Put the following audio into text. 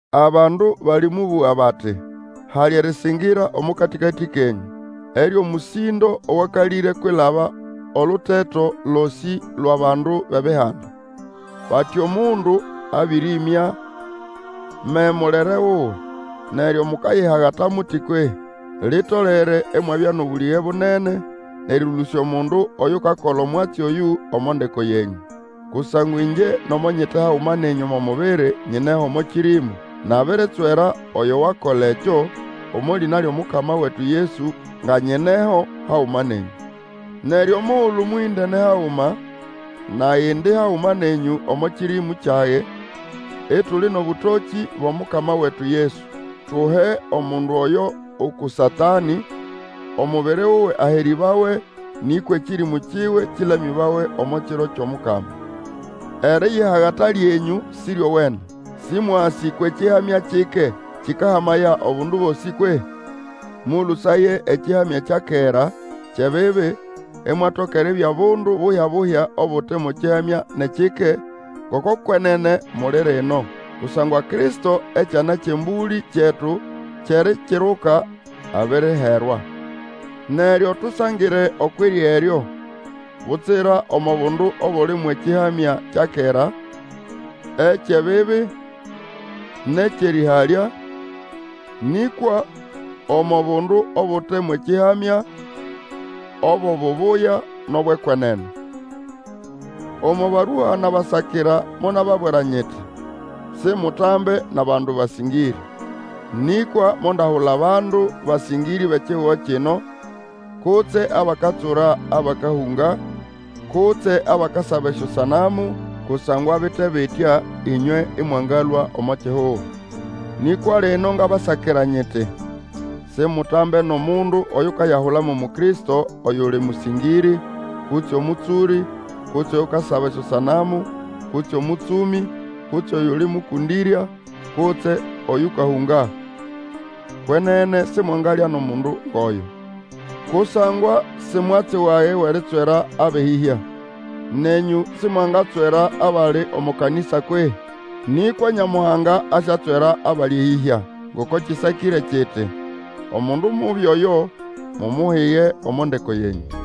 Abandu balĩmũbũga bati, hali erĩsĩngĩra omo katĩkatĩ kenyũ, eryo mũsĩndo owakalĩre kwilaba oluteto losĩ lwʼabandu bʼEbihanda. Bati, omundu abĩrĩmya me-mulere wuwe! Neryo mukayihagala muti kwehĩ? Litolere imwabya nʼobũlĩge bunene, nʼerĩlũsya omundu oyukakola omwatsi oyũ omo ndeko yenyũ. Kusangwa ĩngye nomo nyite haguma nenyũ omo mubiri, nyineyo omo kĩrĩmũ, nabiritswera oyo wakola ekyo, omo lĩna lyʼomukama wetu Yesu nga nyineho haguma nenyũ. Neryo omugulu mũhĩndene haguma, nage indi haguma nenyũ omo kĩrĩmũ kyage, ituli nʼobũtokĩ bwʼomukama wetu Yesu, tuhe omundu oyo uku Satanĩ, omubiri wuwe aherĩbawe, nĩkwa ekĩrĩmũ kiwe kĩlamĩbawe omo Kiro kyʼomukama. Eriyihagata lyenyũ Sĩryowene! Sĩmwasĩ kwʼekĩhamya kike kĩkahamaya obundu bosĩ kwehĩ? Mũlũsaye ekĩhamya kya kera, kyʼebibi, imwatoka eribya bundu buhya-buhya obute mo kĩhamya nʼekike, ngoko kwenene muli rino. Kusangwa Kristo ekyana kyʼembũlĩ kyetu kyʼErikiruka, abiriherwa. Neryo tusangire okwʼirya eryo, butsira omo bundu obuli mwʼekĩhamya kya kera, ekyʼebibi nʼekyʼerĩhalya, nĩkwa omo bundu obute mwʼekĩhamya, obwʼobubuya nʼobwʼekwenene. Omo barua nabasakira monababwira nyiti, simutambe nʼabandu basĩngĩrĩ. Nĩkwa mondahula bandu basĩngĩrĩ bʼekihugo kino, kutse abakatsura abakahũnga, kutse abakasaba esyosanamu, Kusangwa bite bitya ĩnywe ĩmwangalũa omo kihugo. Nĩkwa lino ngabasakira nyiti, simutambe nʼomundu oyukayahula mo Mukristo, oyuli mũsĩngĩrĩ, kutse omũtsũrĩ, kutse oyukasaba esyosanamu, kutse omũtsũmĩ, kutse oyuli mũkũndĩrya, kutse oyũkahũnga. Kwenene simwangalya nʼomundu ngʼoyo. Kusangwa si mwatsi wage wʼeritswera abʼeyĩhya. Nenyũ simwangatswera akali omo kanĩsa kwehĩ? Nĩkwa Nyamuhanga asyatswera abali eyĩhya. Ngoko kĩsakĩre kiti, Omundu mubi oyo, mumuhige omo ndeko yenyũ.